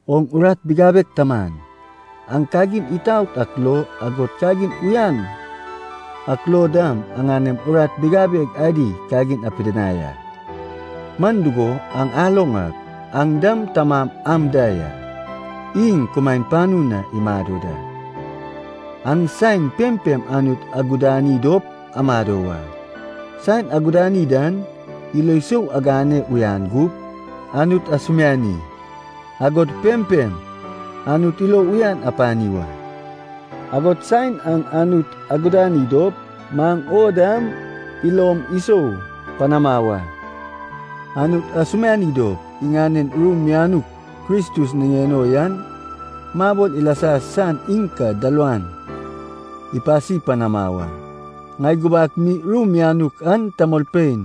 Oŋ urat bigabeg taman, aŋ kagin itaot ak lo, agod kagin uyan ak lo dam, aŋanem urat bigabeg adi kagin apidinai a. Man dugo, aŋ aloŋ ak, aŋ dam tamam am da ya, iŋ kumaen panu na imado da. Aŋ saen pempem Anut agudani dop amado wa. Saen agudani dan, ilo sou agane uyan gup, Anut asumiani, agod pempem Anut ilo uyan apani wa. Agod saen aŋ Anut agudani dop, maŋ o dam ilom isou panama wa. Anut asumiani dop, iŋanen ru mianuk Kristus niŋen o yan mabol ilasa san iŋ ka dalawan ipasi panama wa. Ŋai gubak mi ru mianuk an tamolpein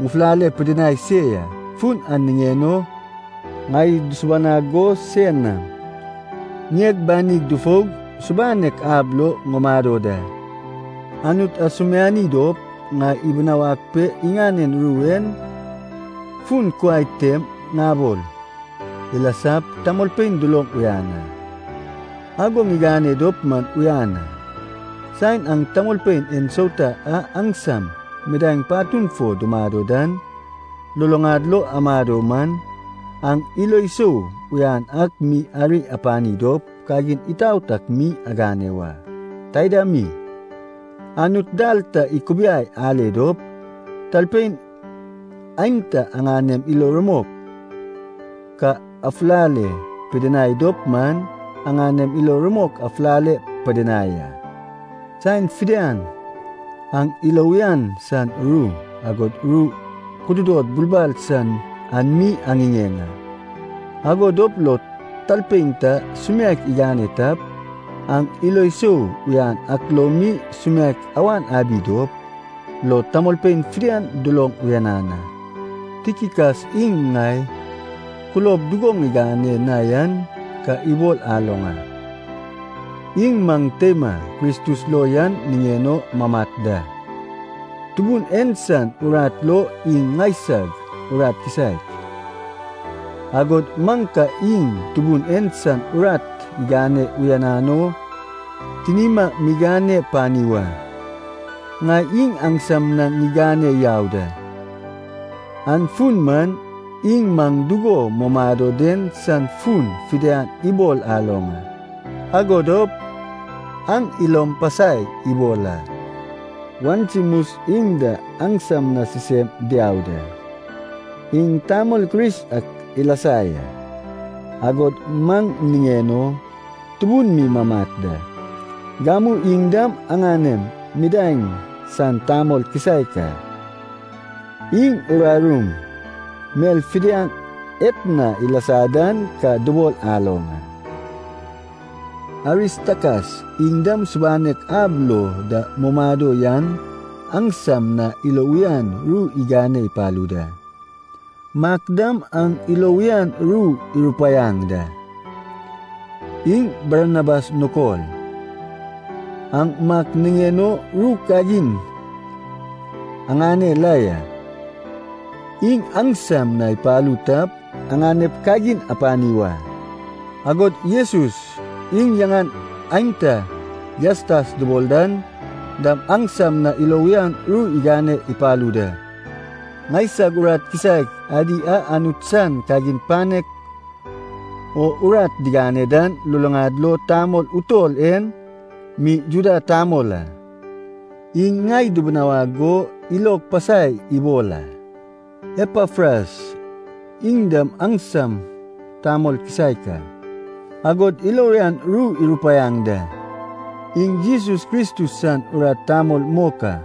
ŋufulale pidinai se ya. Fun an niŋen o ŋai dusubanag go sein nam ŋieg banig dufoug subanek ab lo ŋumado da. Anut asumiani dop ŋai ibinawag pe iŋanen ru en fun kuai tem ŋabol ilasap, tamolpein duloŋ uyan a. Ago ŋigane dop man uyan a. Saen aŋ tamolpein ensauta a aŋsam midaeŋ patun fo dumado dan luluŋad lo amado man, aŋ ilo sou uyan ak mi ari apani dop, kagin itaot ak mi agane wa. Taida mi, Anut dal ta ikubiai ale dop, talpein aenta aŋanem ilo rumok ka afulale pidinai dop man, aŋanem ilo rumok afulale pidinai a. Saen fidian aŋ ilo uyan san ru, agod ru kududod bulbal san an mi aŋiŋeŋ a. Ago dop lo talpein ta sumiaek igane tap, aŋ ilo sou uyan ak lo mi sumiaek awan abi dop, lo tamolpein fidian duloŋ uyanan a. Tikikas iŋ ŋai kulob dugo ŋigane na yan ka ibol aloŋ a. Iŋ maŋ teima Kristus lo yan niŋen o mamat da, Tubun en san urat lo iŋ ŋaisag urat kisaek, agod maŋ ka iŋ Tubun en san urat igane uyanan o tinima migane pani wa. Ŋai iŋ aŋsam na ŋigane yau da. An fun man, iŋ maŋ dugo mumado den san fun fidian ibol aloŋ a, ago dop aŋ ilom pasai ibol a. Onesimus iŋ da aŋsam na sisem diau da. Iŋ tamol Kris ak ilasa ya, agod maŋ niŋen o tubun mi mamat da. Gamu iŋ dam aŋanem midaeŋ san tamol kisaek a. Iŋ urarum mel fidian etna ilasa dan ka dubol aloŋ a. Aristakas, iŋ dam subanek ab lo da mumado yan aŋsam na ilo uyan ru igane ipalu da. Mak dam aŋ ilo uyan ru irupaiaŋ da, iŋ Barnabas nukol. Aŋ Mak niŋen o ru kagin aŋane la ya. Iŋ aŋsam na ipalu tap, aŋanep kagin apani wa. Agod Jesus, iŋ yaŋan aenta Jastas dubol dan dam aŋsam na ilo uyan ru igane ipalu da. Ŋaisag urat kisaek adi a Anut san kagin panek o urat digane dan, luluŋad lo tamol utol en mi Juda tamol a. Iŋ ŋai dubunawag go ilog pasai ibol a. Epafras, iŋ dam aŋsam tamol kisaek a, agod ilo uyan ru irupaiaŋ da. Iŋ Jesus Kristus san urat tamol mok a.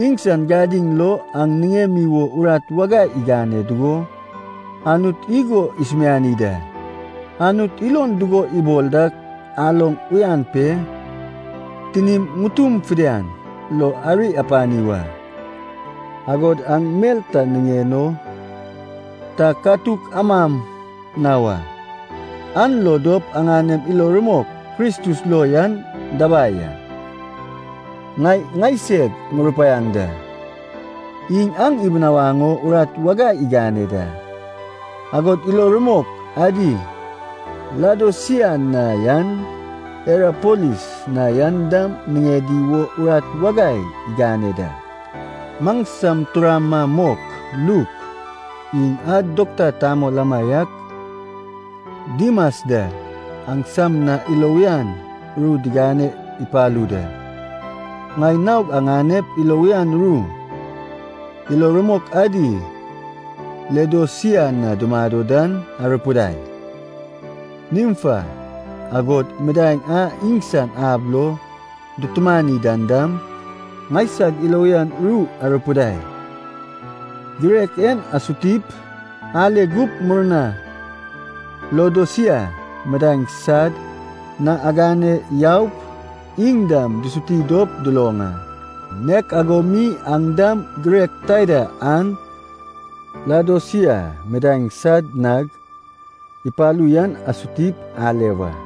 Iŋsan gadiŋ lo aŋ niŋemi wo urat wagai igane dugo, Anut igo isumiani da: Anut ilon dugo ibol dak aloŋ uyan pe, tinim ŋutum fidian lo ari apani wa, agod aŋ mel ta niŋen o, ta katuk amam na wa, an lo dop aŋanem ilo rumok Kristus lo yan dabai a. Ŋai ŋaiseg ŋurupaiaŋ da, iŋ aŋ ibinawaŋ o urat wagai igane da, agod ilo rumok adi Laodosia na yan, Hirapolis na yan dam niŋedi wo urat wagai igane da. Maŋsam turama mok, Luk, iŋ a dokta tamol amaiak, Dimas da aŋsam na ilo uyan ru digane ipalu da. Ŋai naog aŋanep ilo uyan ru, ilo rumok adi Laodosia na dumado dan arupidai. Nimfa, agod midaeŋ a iŋsan ab lo dutumani dan dam, ŋaisag ilo uyan ru arupidai. Girek en asutip ale gup murna Laodosia midaeŋ sad na agane yaup, iŋ dam dusuti dop duloŋ a. Nek ago mi aŋ dam girek taida an Laodosia midaeŋ sad nag ipalu yan asutip ale wa.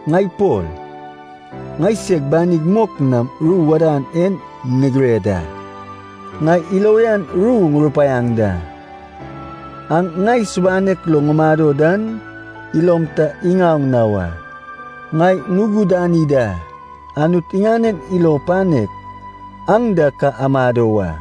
Ŋai Pol, ŋaiseg banig mok nam ru wadan en ŋigire da. Ŋai ilo uyan ru ŋurupaiaŋ da. Aŋ ŋai subanek lo ŋumado dan, ilom ta iŋaoŋ na wa. Ŋai ŋugudani da, Anut iŋanen ilo panek aŋ da ka amado wa.